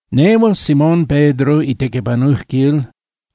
Nehual Simón Pedro itequipanujquil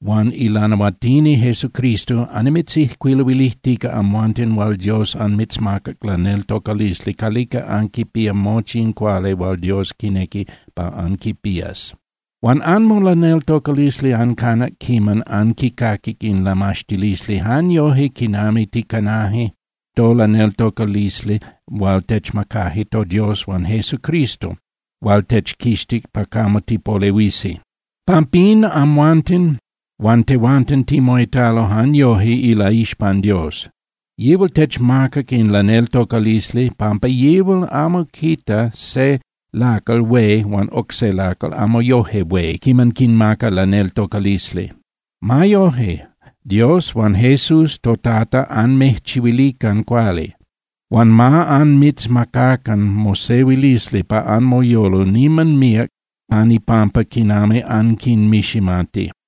huan ilanahuatini Jesucristo annimitzijcuiluilijtica amhuanten hual Dios anmitzmacac laneltocalisli calica anquipía mochi in cuali hual Dios quinequi pa anquipías. Huan anmolaneltocalisli ancanac quiman anquicaquic in lamaxtilisli jan yoje quinami ticanaje tolaneltocalisli hual techmacaje toDios huan Jesucristo hual techquixtic pa camo tipolehuisi. Pampín amhuanten huan tehuanten timoitalo jan yoje ilaixpan Dios. Yihual techmacac in laneltocalisli pampa yihual amo quita se lacal hué huan oc se lacal amo yoje hué quiman quinmaca laneltocalisli. Ma Dios huan Jesús toTata anmijchihuilican cuali. Huan ma anmitzmacacan mosehuilisli pa anmoyolo niman míac pan ipampa quinami anquinmiximati.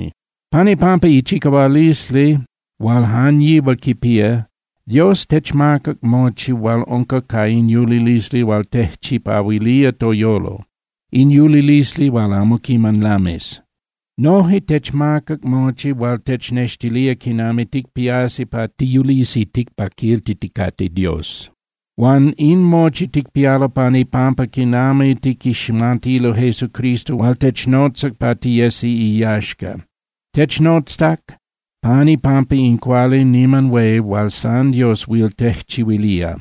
Pan ipampa ichicahualisli hual jan yihual quipía, Dios techmacac mochi hual unca ca in yulilisli hual tejchipahuilía toyolo, in yulilisli hual amo quiman lamis. Noje techmacac mochi hual technextilía quinami ticpiasi pa tiyulisi ticpaquiltiticate Dios. Huan in mochi ticpialo pan ipampa quinami tiquiximatilo Jesucristo hual technotzac pa tiyesi iyaxca. Technotzac pan ipampa in cuali niman hué hual san Dios huil tejchihuilía.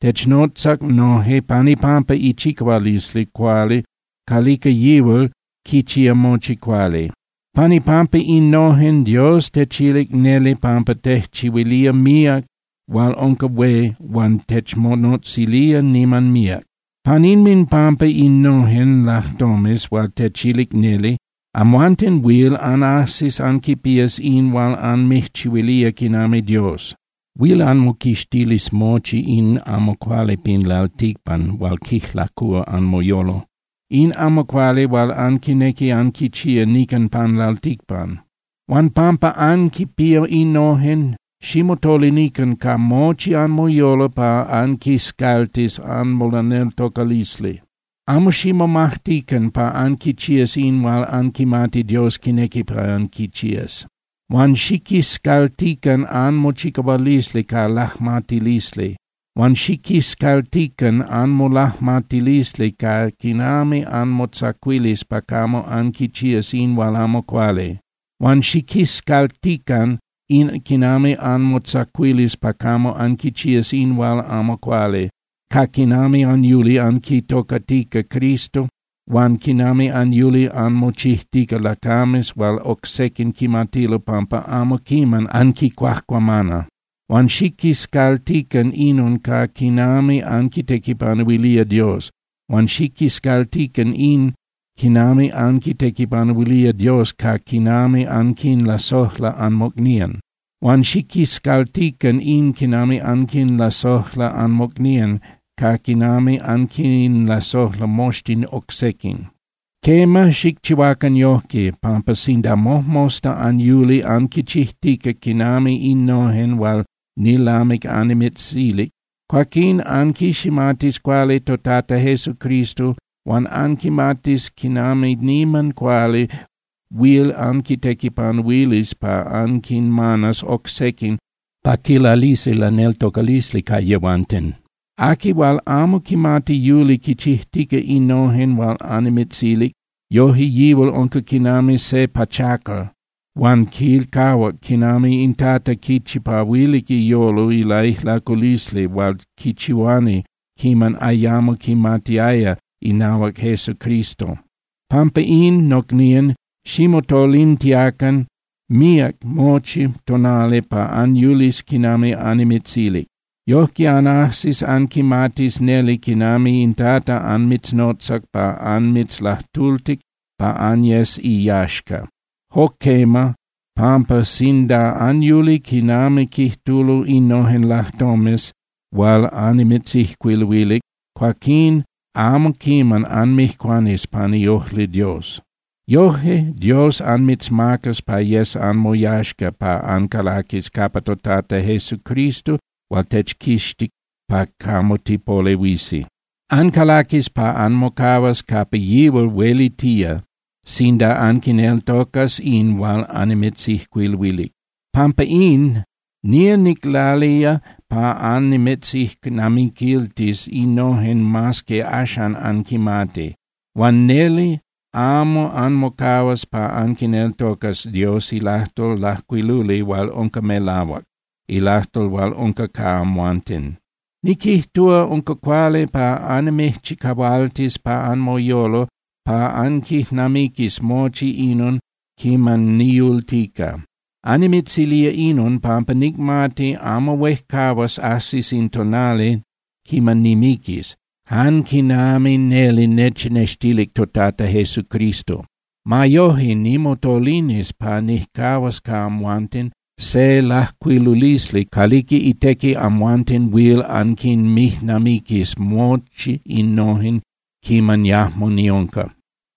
Technotzac noje pan ipampa ichicahualisli cuali calica yihual quichía mochi cuali. Pan ipampa innojen, Dios techilic neli pampa tejchihuilía míac hual unca hué huan techmonotzilía niman míac. Pan inminpampa innojen lajtomes hual techilic neli, amhuanten huil anajsis anquipías in hual anmijchihuilía quinami Dios. Huil anmoquixtilis mochi in amo cuali pin lalticpan hual quijlacúa anmoyolo, in amo cuali hual anquinequi anquichía nican pan lalticpan. Huan pampa anquinpía innojen, ximotolinican ca mochi anmoyolo pa anquiscaltis anmolaneltocalisli. Amo ximomajtican pa anquichías in hual anquimati Dios quinequi pa anquichías. Huan xiquiscaltican anmochicahualisli ca lajmatilisli. Huan xiquiscaltican anmolajmatilisli ca quinami anmotzacuilis pa camo anquichías in hual amo cuali. Huan xiquiscaltican in quinami anmotzacuilis pa camo anquichías in hual amo cuali ca quinami anyuli anquitocatica Cristo huan quinami anyuli anmochijtica lacames hual oc sequin quimatilo pampa amo quiman anquicuajcuamana. Huan xiquiscaltican inon ca quinami anquitequipanuilía Dios. Huan xiquiscaltican in quinami anquitequipanuilía Dios ca quinami anquinlasojla anmocnían. Huan xiquiscaltican in quinami anquinlasojla anmocnían ca quinami anquinlasojla moxtin oc sequin. Quema, xicchihuacan yojque, pampa sinda mojmosta anyuli anquichijtica quinami innojen hual nilamic annimitzilic, cuaquín anquiximatis cuali toTata Jesucristo huan anquimatis quinami niman cuali huil anquitequipanuilis pa anquinmanas oc sequin pa quilalisi laneltocalisli ca yihual. Aqui hual amo quimati yuli quichijtica innojen hual annimitzilic, yoje yihual unca quinami se pachacal huan quilcahuac quinami in Tata quichipahuilic iyolo ilaijlaculisli hual quichihuani quiman ayamo quimatiaya inahuac Jesucristo. Pampa in, nocnían, ximotolintiacan míac mochi tonali pa anyulis quinami annimitzilic. Yojque anajsis anquimatis neli quinami in Tata anmitznotzac pa anmitzlajtultic pa anyes iyaxca. Jo quema, pampa sinda anyuli quinami quijtulo innojen lajtomes hual annimitzijcuiluilic, cuaquín amo quiman anmijcuanis pan iojli Dios. Yoje Dios anmitzmacas pa yes anmoyaxca pa ancalaquis capa toTata Jesucristo hual techquixtic pa camo tipolehuisi. Ancalaquis pa anmocahuas capa yihual huelitía sinda anquineltocas in hual annimitzijcuiluilic. Pampa in, nía niclalía pa annimitzijnamiquiltis innojen mas que axan anquinmati. Huan neli amo anmocahuas pa anquineltocas Dios ilajtol lajcuiluli hual unca melahuac, ilajtol hual unca ca amhuanten. Niquijtúa unca cuali pa annimijchicahualtis pa anmoyolo pa anquijnamiquis mochi inon quiman niyultica. Annimitzilía inon pampa nicmati amo huejcahuas ajsis in tonali quiman nimiquis, jan quinami neli nechnextilic toTata Jesucristo. Ma yoje, nimotolinis pa nijcahuas ca amhuanten se lajcuilulisli calica itequi amhuanten huil anquinmijnamiquis mochi innojen quiman yajmo niunca.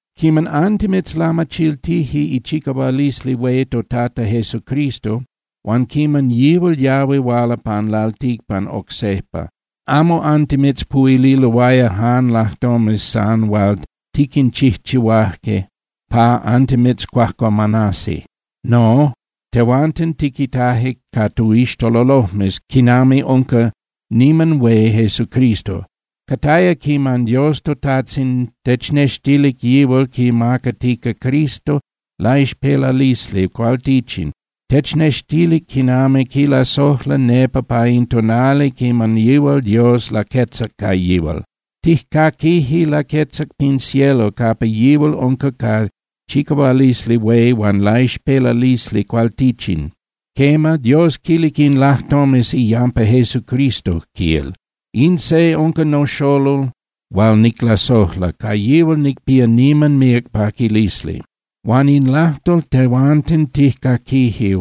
Quiman antimitzlamachiltije ichicahualisli hué toTata Jesucristo huan quiman yihual yahui huala pan lalticpan oc sejpa, amo antimitzpuhuililoaya jan lajtomes san hual tiquinchijchihuaje pa antimitzcuajcuamanasi. No, tehuanten tiquitaje ca toixtololojmes quinami unca niman hué Jesucristo. Cataya quiman Dios toTajtzin technextilic yihual quimacatica Jesucristo laixpelalisli cualtichin, technextilic quinami quilasojla nepa pa in tonali quiman yihual Dios laquetzac ca yihual. Tijcaquije laquetzac pin cielo capa yihual unca ca chicahualisli hué huan laixpelalisli cualtichin. Quema, Dios quilic in lajtomes iyampa Jesucristo, quil: “In se unca noXolol hual niclasojla, ca yihual nicpía niman míac paquilisli.” Huan in lajtol tehuanten tijcaquije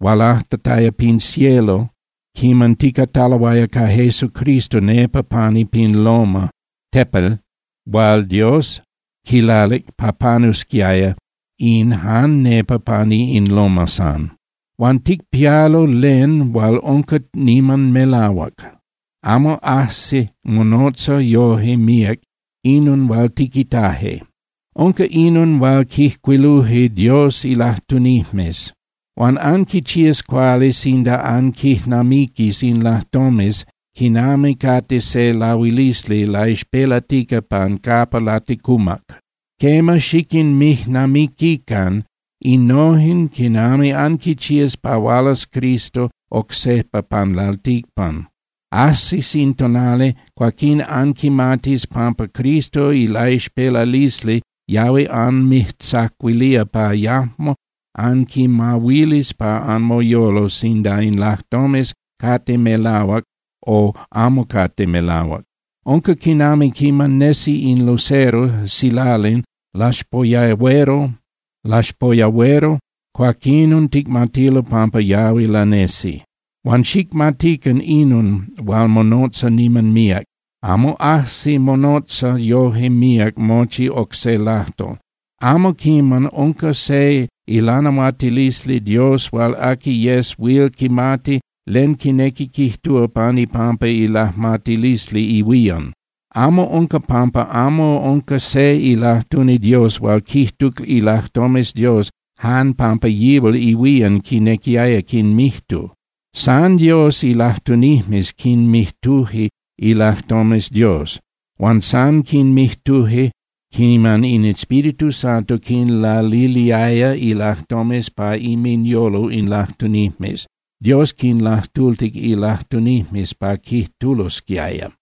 hualajtataya pin cielo quiman ticataloaya ca Jesucristo nepa pani pin loma (tepel) hual Dios quilalic pa panusquiaya in jan nepa pani in loma san. Huan ticpialo len hual unca niman melahuac, amo ajsi monotza yoje míac inon hual tiquitaje. Unca inon hual quijcuiluje Dios ilajtunijmes. Huan anquichías cuali sinda anquijnamiquis in lajtomes quinami cate se lahuilisli laixpelatica pan capa laticumac. Quema, xiquinmijnamiquican innojen quiman anquichías pa hualas Cristo oc sejpa pan lalticpan. Ajsis in tonali, cuaquín anquimatis pampa Cristo ilaixpelalisli yahui anmijtzacuilía pa yajmo anquimahuilis pa anmoyolo sinda in lajtomes cate melahuac o amo cate melahuac. Unca quinami quiman nesi in lucero (silalin) laxpoyahuero, cuaquinon ticmatilo pampa yahui lanesi. Huan xicmatican inon hual monotza niman míac. Amo ajsi monotza yoje míac mochi oc se lajtol: Amo quiman unca se ilanahuatilisli Dios hual aqui yes huil quimati len quinequi quijtúa pan ipampa ilajmatilisli ihuían. Inon unca pampa amo unca se ilajtuni Dios hual quijtuc ilajtomes Dios jan pampa yihual ihuían quinequiaya quinmijtu. San Dios ilajtunijmes quinmijtuje ilajtomes Dios. Huan san quinmijtuje quiman in Espíritu Santo quinlaliliaya ilajtomes pa inminyolo in lajtunijmes. Dios quinlajtultic ilajtunijmes pa quijtulosquiaya.